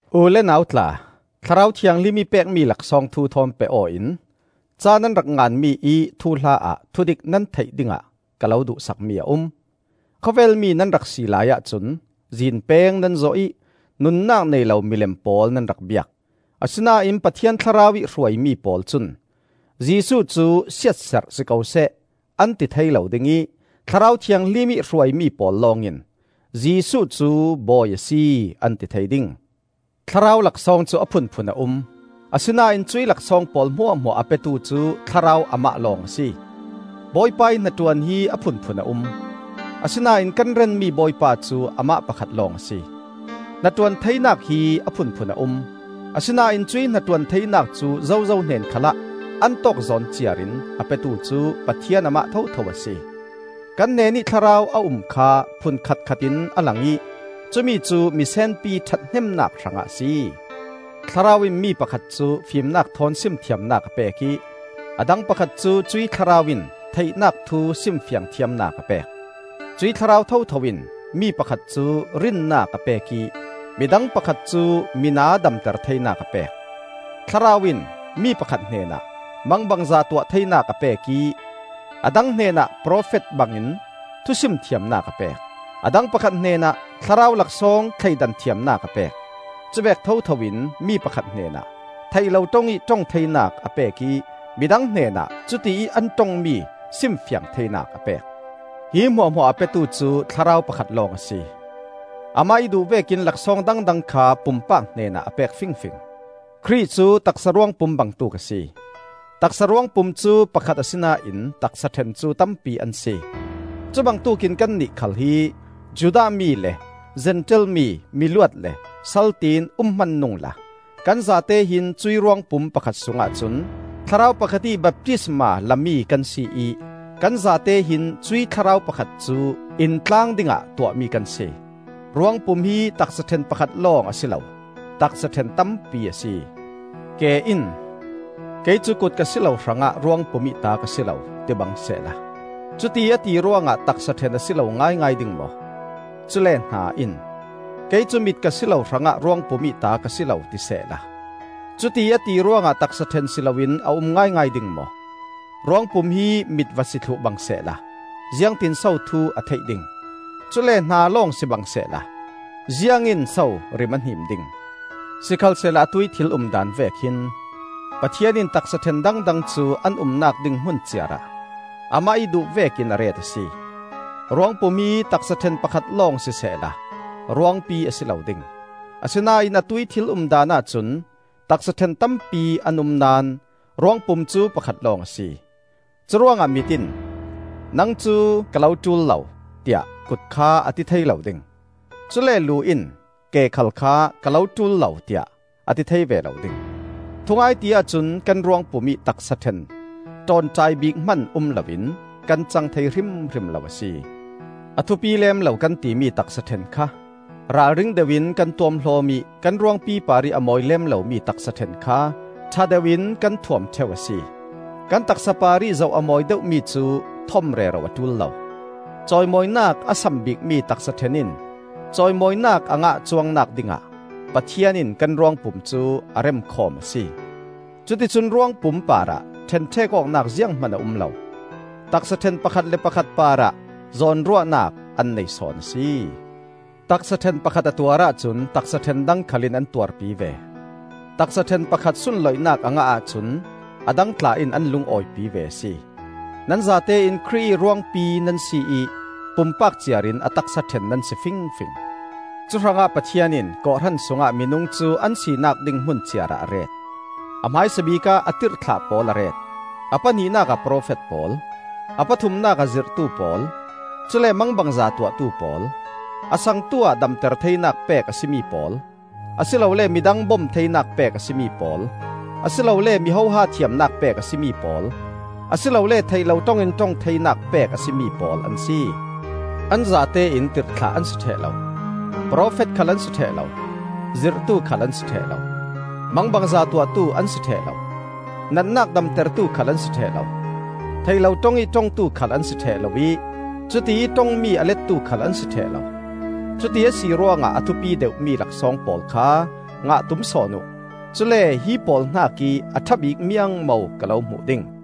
U le nau tla, Thlarau Thianghlim ih pekmi laksawng thu thawn peh aw in ca nan rak nganmi ih thuhla ah thudik nan theih dingah ka lo duhsakmi a um. Khawvel mi nan rak si laiah cun zinpeng nan zawh ih nunnak nei lo milem pawl nan rak biak. Asinain Pathian Thlarau ih hruaimi pawl cun, “Jesuh cu siatserh si ko seh,” an ti thei lo ding ih Thlarau Thianghlim ih hruaimi pawl lawng in, “Jesuh cu Bawi a si,” an ti thei ding. Thlarau laksawng cu a phunphun a um, asinain cuih laksawng pawl hmuahhmuah a petu cu Thlarau Amah lawng a si. Bawipa ih hnaṭuan hi a phunphun a um, asinain kan renmi Bawipa cu Amah pakhat lawng a si. Hnaṭuan theinak hi a phunphun a um, asinain cuih hnaṭuan theinak cu zozo hnen khalah an tawkzawn ciar in a petu cu Pathian Amah thotho a si. Kan hnenih Thlarau a um kha phunkhat khat in a lang ih cumi cu misenpi ṭhathnemnak hrangah a si. Thlarau in mi pakhat cu fimnak thawn simthiamnak a pek ih a dang pakhat cu cuih Thlarau in theihnak thu simfiang thiamnak a pek. Cuih Thlarau thotho in mi pakhat cu rinnak a pek ih midang pakhat cu mina damter theinak a pek. Thlarau in mi pakhat hnenah mangbangza tuah theinak a pek ih a dang hnenah profet bangin thusim thiamnak a pek; a dang pakhat hnenah Thlarau laksawng thleidan thiamnak a pek. Cuvek thotho in mi pakhat hnenah theih lo ṭong ih ṭong theinak a pek ih midang hnenah cutiih an ṭongmi simfiang theinak a pek. Hi hmuahhmuah a petu cu Thlarau pakhat lawng a si; Amah ih duh vekin laksawng dangdang kha pumpak hnenah a pek fingfing. Khrih cu taksa ruangpum bangtuk a si. Taksa ruangpum cu pakhat asinain taksa ṭhen cu tampi an si. Cubangtuk in kannih khal hi Judah mi le Zentail mi, miluat le sal tiin um hman nungla kan zate hin cuih ruangpum pakhat sungah cun Thlarau pakhat ih baptisma lami kan si ih kan zate hin cuih Thlarau pakhat cu intlaang dingah tuahmi kan si. Ruangpum hi taksa ṭhen pakhat lawng a si lo, taksa ṭhen tampi a si. Ke in, “Kei cu kut ka si lo hrangah ruangpum ih ta ka si lo,” tibang sehla, cutiih a ti ruangah taksa ṭhen a si lo ngaingai ding maw? Cule hna in, “Kei cu mit ka si lo hrangah ruangpum ih ta ka si lo,” ti sehla, cutiih a ti ruangah taksa ṭhen si loin a um ngaingai ding maw? Ruangpum hi mit va si thluh bangsehla ziangtinso thu a theih ding? Cule hna lawng sibang sehla ziangin so rim a hnim ding? Sikhalsehla atuih thil umdaan vek hin, Pathian in taksa ṭhen dangdang cu an umnak ding hmun ciarah Amah ih duh vekin a ret a si. Ruangpum hi taksa ṭhen pakhat lawng sisehla ruangpi a si lo ding! Asinain atuih thil umdaan ahcun taksa ṭhen tampi an um naón ruangpum cu pakhat lawng a si. Curuangah mit in, “Nang cu ka lo ṭul lo,” tiah kut kha a ti thei lo ding. Cule lu in ke khal kha, “Ka lo ṭul lo,” tiah a ti thei ve lo ding. Thungai ti ahcun kan ruangpum ih taksa ṭhen ṭawnṭai bik hman um loin kan cang thei hrimhrim lo a si. A thupi lem lo kan timi taksa ṭhen kha ralring deuh in kan tuamhlawm ih kan ruangpi parih a mawi lem lomi taksa ṭhen kha ṭha deuh in kan thuam ṭheu a si. Kan taksa parih zoh a mawi deuhmi cu thom rero a ṭul lo. Cawimawinak a sam bikmi taksa ṭhen in cawimawinak a ngah cuangnak dingah Pathian in kan ruangpum cu a remkhawm a si. Cuticun ruangpum parah ṭhenṭhek awknak zianghman a um lo; taksa ṭhen pakhat le pakhat parah zawnruahnak an nei sawn a si. Taksa ṭhen pakhat a tuar ahcun taksa ṭhen dang khal in an tuarpi ve. Taksa ṭhen pakhat sunloihnak a ngah ahcun a dang tla in an lungawipi ve a si. Nan zatein Khrih ih ruangpi nan si ih pumpak ciarin a taksa ṭhen nan si fingfing. Cuhrangah Pathian in kawhhran sungah minung cu an sinak ding hmun ciarah a ret: a hmaisabik ah a tirhthlah pawl a ret; a pahnihnak ah profet pawl, a pathumnak ah zirhtu pawl, cule mangbangza tuahtu pawl, a sangtuah damter theinak pek a si mi pawl, a si lole midang bom theinak pek a si mi pawl, a si lole mi hoha thiamnak pek a si mi pawl, a si lole theih lo ṭong in ṭong theinak pek a si mi pawl an si. An zatein tirhthlah an si ṭheh lo, profet khal an si ṭheh lo, zirhtu khal an si ṭheh lo. Mangbangza tuahtu an si ṭheh lo, natnak damtertu khal an si ṭheh lo; theih lo ṭong ih ṭongtu khal an si ṭheh lo ih cutiih ṭongmi a lettu khal an si ṭheh lo. Cuti a si ruangah a thupi deuhmi laksawng pawl kha ngah tum sawn uh. Cule hi pawl hnakih a ṭha bik miangmo ka lo hmuh ding.